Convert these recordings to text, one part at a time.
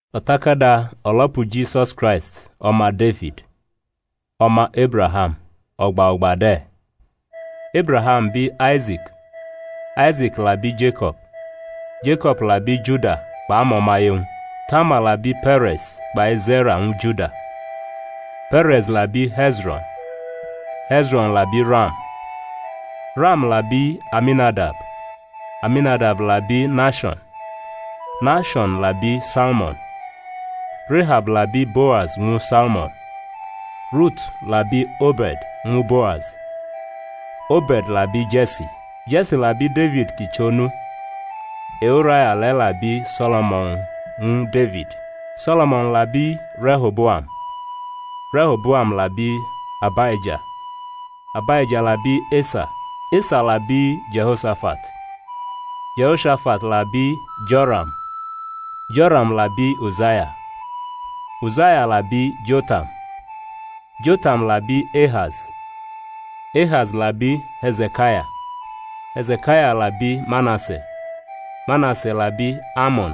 O̩takada o̩lo̩pu Jisus Kraisti o̩ma Defid, o̩ma Ebraham o̩gba o̩gba de̩. Ebraham bi Aise̩k. Aise̩k la bi Jeko̩b. Jeko̩b la bi Juda kpʼamo̩maye-wñ. Tamar la bi Pe̩re̩z kpai Ze̩ra ñwu Juda. Pe̩re̩z la bi He̩zro̩n. He̩zro̩n la bi Ram. Ram la bi Aminadab. Aminadab la bi Naasho̩n. Naasho̩n la bi Salmo̩n. Rehab la bi Boaz ñwu Salmo̩n. Rutu la bi Obe̩d ñwu Boaz. Obe̩d la bi Je̩si. Je̩si la bi Defid kʼi chʼonu. E-Uraya le̩ la bi So̩lo̩mo̩n ñwu Defid. So̩lo̩mo̩n la bi Reho̩boam. Reho̩boam la bi Abaija. Abaija la bi Esa. Esa la bi Jeho̩shafat. Jeho̩shafat la bi Jo̩ram. Jo̩ram la bi Uzaya. Uzaya la bi Jotam. Jotam labi Ehaz. Ehaz la bi He̩ze̩kaya. He̩ze̩kaya la bi Manase. Manase la bi Amo̩n.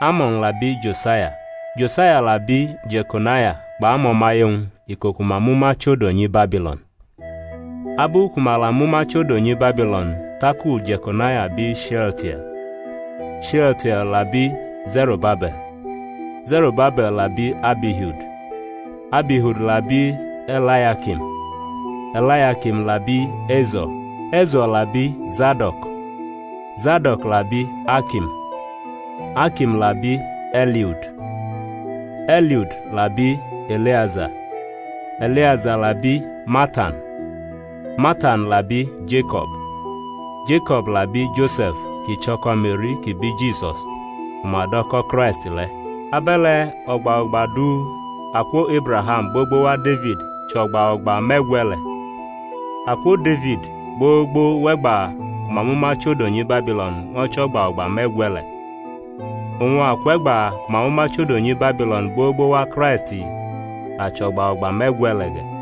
Amo̩n la bi Josaya. Josaya la bi Je̩konaya kpʼamo̩maye-wñ iko ku ma mʼuma chʼodo nyi Babilo̩n. Abu ku ma la mʼuma chʼodo nyi Babilo̩n taku Je̩konaya bi She̩altie̩l. Shealtie̩l la bi Ze̩ro̩babe̩l. Ze̩ro̩babe̩l la bi Abihud. Abihud la bi E̩layakim. E̩layakim la bi Ezo̩r. Ezo̩r la bi Zado̩k. Zado̩k la bi Akim. Akim la bi E̩liud. E̩liud la bi E̩leaza. E̩leaza la bi Matan. Matan la bi Jeko̩b. Jeko̩b la bi Jose̩f kʼi chʼo̩ko̩ Me̩ri kʼi bi Jisus ku ma do̩ ko̩ Kraisti le̩. Abe̩le̩ o̩gba o̩gba du akwo Ebraham gbogbo wa Defid chʼo̩gba o̩gba me̩gwe̩le̩; akwo Defid gbogbo wʼe̩gba ku ma mʼuma chʼodo nyi Babilo̩n ño̩ chʼo̩gba o̩gba me̩gwe̩le̩; oñ akwʼe̩gba ku ma mʼuma chʼodo nyi Babilo̩n gbogbo wa Kraisti la chʼo̩gba o̩gba me̩gwe̩le̩ ge̩.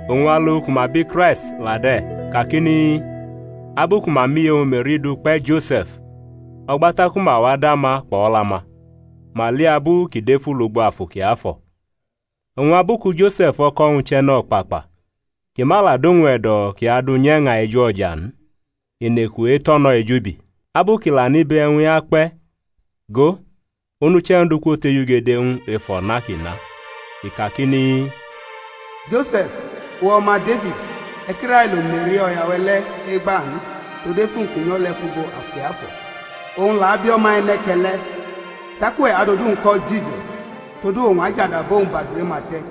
Oñ alu ku ma bi Kraisti la de̩ kakini, Abu ku ma mʼiye-wñ Me̩ri du kpe̩ Jose̩f, o̩gba taku ma wa dama kpʼo̩la-ma, ma li abu kʼi defu lugbo Afu Kiafo̩. Oñ abu ku Jose̩f o̩ko̩-wñ chʼe̩no̩kpakpa, ki ma la dʼowñ e̩do̩ kʼi adʼu nye̩ña ejo̩ja n, i nʼeku etʼo̩ no̩ ejubi. Abu kʼi la nʼibe e̩wñ-i akpe̩, go, onuche̩ Ondu kwotejugede ñw u ef o̩na kʼi na. I kakini, Jose̩f, uwe̩ o̩ma Defid, e̩ ki railo Me̩ri, o̩ya-we̩ le̩ egba n; todu efu-wñ kʼi nyo̩ le̩ kwʼugbo Afu Kiafo̩. Owñ la abi o̩ma e̩ne̩ke̩le̩, tak uwe̩ adʼodu-wñ ko̩ Jisus; todu owñ ajadu abo-wñ bʼadure-ma te̩.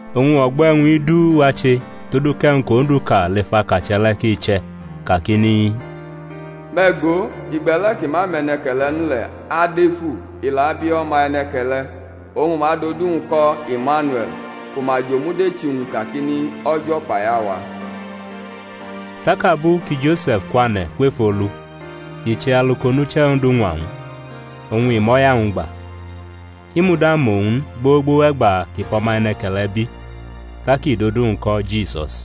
Oñ o̩gbo̩ e̩wñ-i du wa che todu kʼe̩wñ kʼOndu ka lef akache̩ le̩ ki che̩ kakini, Me̩ go, igbe̩le̩ ki ma mʼe̩ne̩ke̩le̩ n le̩ adefu, i la abi o̩ma e̩ne̩ke̩le̩, oñ ma adʼodu-wñ ko̩ Imaniue̩l; ku ma jʼomudechi-wñ kakini, O̩jo̩ kpai awa. Tak abu ki Jose̩f kwane̩ kwef olu i che alu kʼonuche̩ Ondu ñwa ñw u, oñ i mʼo̩ya-wñ gba; i muda mʼowñ n gbogbo wʼe̩gba kʼi fʼo̩ma e̩ne̩ke̩le̩ bi; tak i dʼodu-wñ ko̩ Jisus.